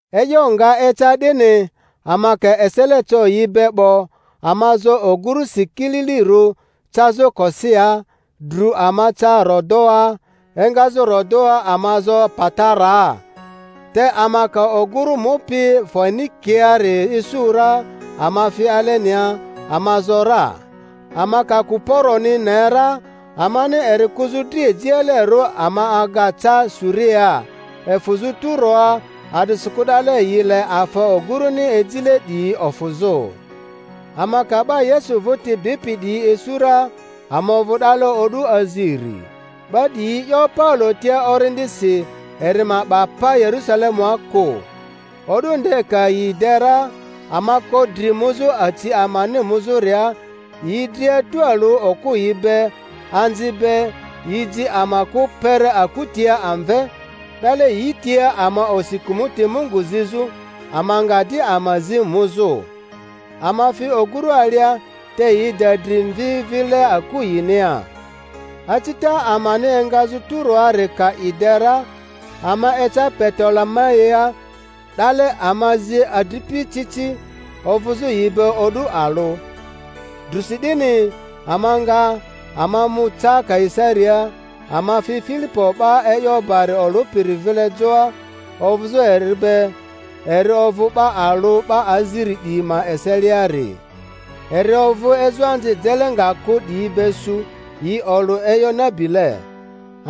E'yo nga eca 'dini, ama ka esele co yi be 'bo, ama zo ogurᴜsi kililirᴜ cazᴜ Kosia, dru ama ca Rodoa, engazᴜ Rodoa ama zo Pataraa. Te ama ka ogurᴜ mupi Foenikiari isu ra, ama fi alenia, ama zo ra. Ama ka Kuporoni ne ra, amani eri kᴜzᴜ dri ejialerᴜ ama aga ca Suriaa, efᴜzᴜ Turoa; a'disikᴜ 'dale yi le afa ogᴜrᴜni ejile 'diyi ofᴜzᴜ. Ama ka 'ba Yesu vᴜti bipi 'diyi isu ra, ama ovᴜ 'dale o'du aziri. 'Ba 'diyi 'yo Paulo tia Orindi-si eri ma 'ba pa Yerᴜsalemua kᴜ. O'du nde ka yi de ra, ama ko dri muzᴜ aci amani muzᴜria; yi dria tualᴜ okᴜyi be, anzi be, yi ji ama kᴜ kpere aku tia amve; 'dale yi tia ama osi kᴜmᴜti Mungu zizᴜ, ama nga di ama zi muzᴜ. Ama fi ogᴜrᴜ alia, te yi da dri mvi vile aku yinia. Acita amani engazᴜ Turoari ka i de ra, ama eca Petolemaia; 'dale ama zi adripi ci ci, ovᴜzᴜ yi be o'du alᴜ. Drᴜsi 'dini ama nga, ama mu ca Kaisariaa; ama fi Filipo 'ba e'yo bari olᴜpiri vile joa, ovᴜzᴜ erᴜ be, eri ovᴜ 'ba alᴜ 'ba aziri 'diyi ma eseliari. Eri ovᴜ ezoanzi jele nga kᴜ 'diyi be su, yi olᴜ e'yo nabile.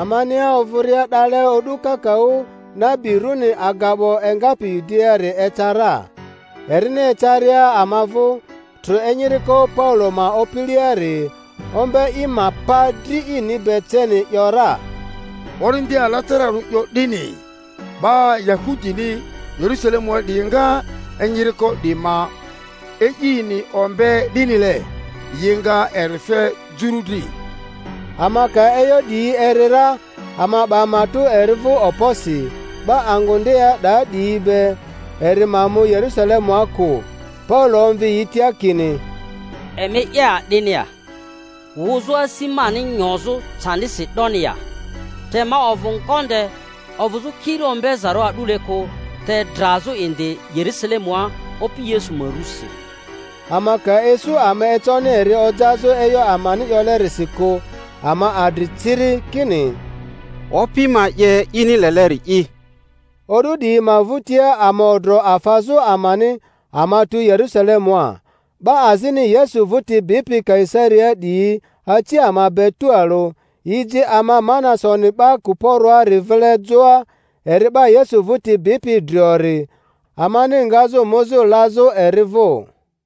Amania ovᴜria 'dale o'du kakaᴜ nabi rᴜni Agabo engapi Yudiaari eca ra. Erini ecaria ama vᴜ, trᴜ enyiriko Paulo ma opileari, ombe i ma pa dri ini be ceni, ‘yora, Orindi Alatararᴜ 'yo 'dini, 'Ba Yahudini Yerᴜsalemua 'diyi nga enyiriko 'di ma e'ini ombe 'dinile, yi nga eri fe Juru dri. Ama ka e'yo 'diyi eri ra, ama 'ba matᴜ eri vᴜ okposi, 'ba angᴜ ndea 'da 'diyi be, eri ma mu Yerusalemua kᴜ. Paulo omvi yi tia kini, Emi 'ye a'dini ya, wᴜzᴜ asi mani nyozᴜ candisi 'doni ya? Te ma ovᴜ ngonde ovᴜzᴜ kiri ombezarᴜ a'dule kᴜ, te drazᴜ indi Yerusalemua Opi Yesu ma rᴜsi. Ama ka isu ama econi eri ojazᴜ e'yo amani 'yolerisi kᴜ, ama adri ciri, kini, Opi ma 'ye ini leleri'i. O'du 'diyi ma vᴜtia ama odro afazᴜ amani, ama tu Yerᴜsalemua. 'Ba azini Yesu vᴜti bipi Kaisariaa 'diyi aci ama be tualᴜ, yi ji ama Manasoni 'ba Kuporoari vile joa, eri 'ba Yesu vᴜti bipi driori, amani ngazᴜ muzᴜ lazᴜ eri vᴜ.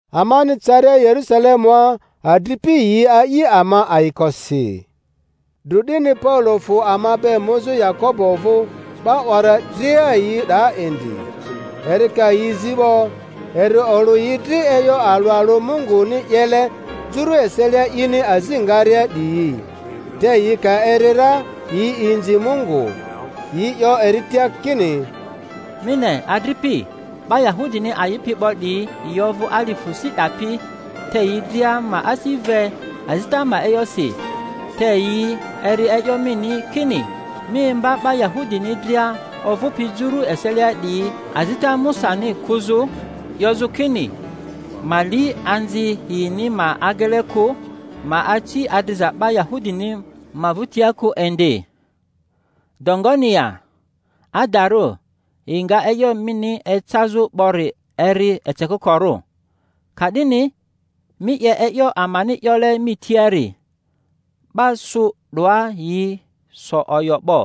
Amani caria Yerᴜsalemua adri-pi yi a'i ama ayikosi. Dru 'dini Paulo fᴜ ama be muzᴜ Yakobo vᴜ; 'ba 'wara dria yi 'daa indi. Eri ka yi zi 'bo, eri olᴜ yi dri e'yo alᴜ alᴜ Munguni 'yele Juru eselia ini azi ngaria 'diyi. Te yi ka eri ra, yi inzi Mungu. Yi 'yo eri tia kini, Mi ne, adripi, 'ba Yahudini a'ipi 'bo 'diyi yi ovᴜ alifᴜ si 'dapi; te yi dria ma asi ve azita ma e'yosi; te yi eri e'yo mini, kini mi imba 'ba Yahudini dria ovᴜpi Juru eselia 'diyi azita Musani kᴜzᴜ, 'yozᴜ kini ma li anzi yini ma agele kᴜ, ma aci adriza 'ba Yahudini ma vᴜtia kᴜ indi. 'Do ngoni ya? Adarᴜ, yi nga e'yo mini ecazᴜ 'bori eri eceko-korᴜ. Ka'dini mi 'ye e'yo amani 'yole mi tiari. 'Ba su 'doa yi so oyo 'bo;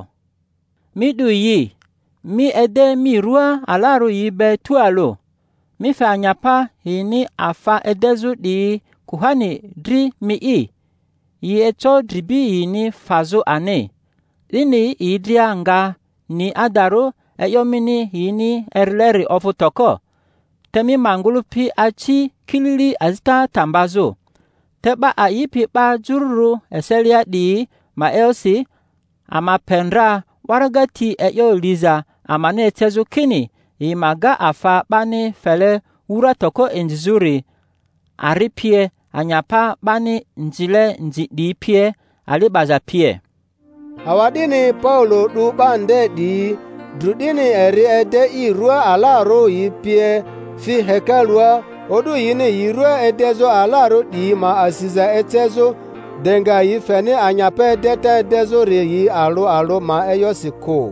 mi 'du yi, mi ede mi rᴜa alarᴜ yi be tualᴜ, mi fe anyapa yini afa edezᴜ 'diyi kuhani dri mi'i, yi eco dribi yini fazᴜ ani. 'Dini yi dria nga ni adarᴜ e'yo mini yini erileri ovᴜ toko, te mi ma ngᴜlᴜpi aci kilili azita ta mbazᴜ. Te 'ba a'ipi 'ba Jururᴜ eselia 'diyi ma e'yosi, ama pe ndra waraga ti e'yo liza amani ecezᴜ, kini yi ma ga afa 'bani fele wura toko inzizᴜri, ari pie, anyapa 'bani nzile nzi 'diyi pie, ali 'baza pie. Awa'dini Paulo 'du 'ba nde 'diyi, dru 'dini eri ede i rua alarᴜ yi pie, fi hekalua o'du yini yi rᴜa edezᴜ alarᴜ 'diyi ma asiza ecezᴜ, de nga yi feni anyapa edeta edezᴜri yi alᴜ alᴜ ma e'yosi kᴜ.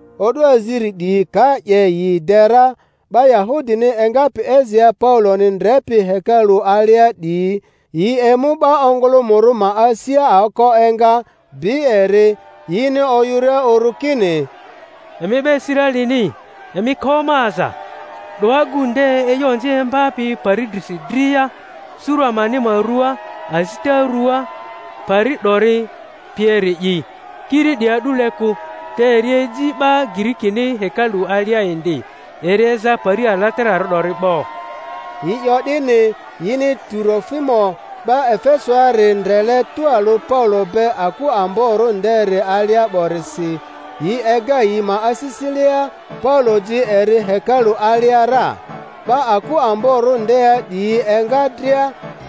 O'du aziri 'diyi ka 'ye yi de ra, 'ba Yahudini engapi Asiaa Pauloni ndrepi hekalᴜ alia 'diyi, yi emu 'ba ongᴜlᴜmᴜrᴜ ma asia aoko enga, bi eri, yini oyᴜria uru kini, Emi 'ba Israelini, emi ko ama aza! 'Do agu nde e'yo onzi imbapi pari drisi dria, suru amani ma rᴜaa, azita ruaa, pari 'dori pieri'i; kiri 'di a'dule kᴜ, te eri eji 'ba Girikini hekalu alia indi, eri eza pari alatararᴜ 'dori 'bo. Yi 'yo 'dini yini Turofimo 'ba Efesoari ndrele tualᴜ Paulo be aku amborᴜ nderi alia 'borisi, yi ega yi ma asisilea Paulo ji eri hekalu alia ra. 'Ba aku amborᴜ ndea 'diyi enga dria,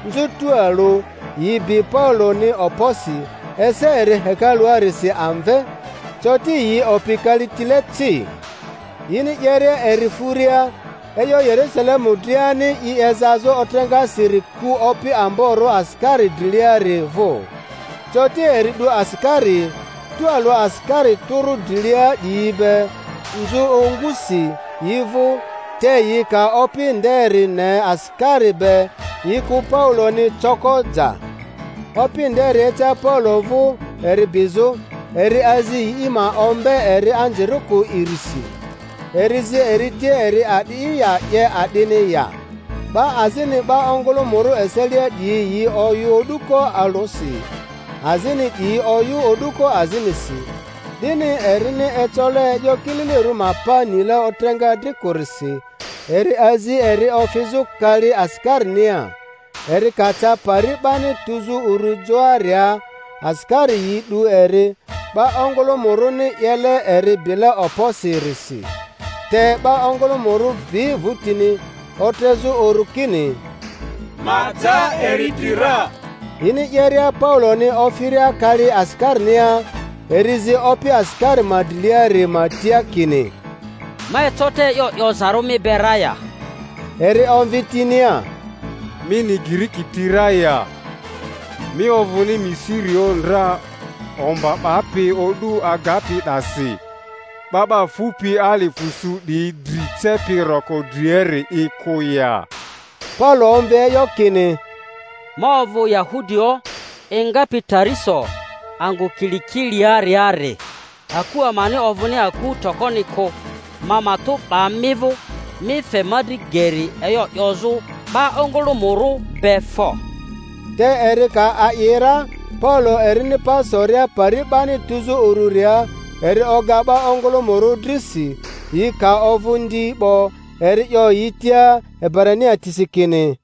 nzᴜ tualᴜ; yi bi Pauloni okposi, ese eri hekaluarisi amve, coti yi opi kalitile ci. Yini 'yeria eri furia, e'yo Yerᴜsalemu driani i ezazᴜ otreŋasiri ku opi amborᴜ asikari driliari vᴜ. Coti eri 'du asikari, tualᴜ asikari tᴜrᴜ drilia 'diyi be, nzᴜ ongusi yi vᴜ; te yi ka opi nderi ne asikari be, yi kᴜ Pauloni coko ja. Opi nderi eca Paulo vᴜ eri bizᴜ, eri azi yi ma ombe eri anzirikᴜ irisi. Eri zi eri tia eri a'di'i ya, 'ye a'dini ya? 'Ba azini 'ba ongᴜlᴜmᴜrᴜ eselia 'diyi yi oyᴜ o'duko alᴜsi, azini 'diyi oyᴜ o'duko azinisi; 'dini erini ecole e'yo kililirᴜ ma pa nile otreŋa dri kᴜrisi, eri azi eri ofizᴜ kali asikarinia. Eri ka ca pari 'bani tuzᴜ uru joaria, asikari yi 'du eri, 'ba ongᴜlᴜmᴜrᴜni 'yele eri bile okposi-risi; te 'ba ongᴜlᴜmᴜrᴜ bi vᴜtini, otrezᴜ uru kini, Ma ja eri dri ra! Yini 'yeria Pauloni ofiria kali asikarinia, eri zi opi asikari ma driliari ma tia kini, Ma eco te e'yo 'yozarᴜ mi be ra ya? Eri omvi tinia, Mi ni Giriki ti ra ya? Mi ovᴜni Misirioᴜ ndra omba 'bapi o'du agapi 'dasi, 'ba 'ba fupi alifᴜ su 'diyi dri cepi roko driari'i kᴜ ya? Paulo omvi e'yo kini, Ma ovᴜ Yahudioᴜ engapi Tariso angᴜ Kilikiaariari, aku amani ovᴜni aku tokoni kᴜ; ma matᴜ 'ba mi vᴜ, mi fe ma dri geri e'yo 'yozᴜ 'ba ongᴜlᴜmᴜrᴜ be fo. Te eri ka a'i ra, Paulo erini pa soria pari 'bani tuzᴜ ururia, eri oga 'ba ongᴜlᴜmᴜrᴜ drisi; yi ka ovᴜ ndi 'bo, eri 'yo yi tia Ebrania tisi kini: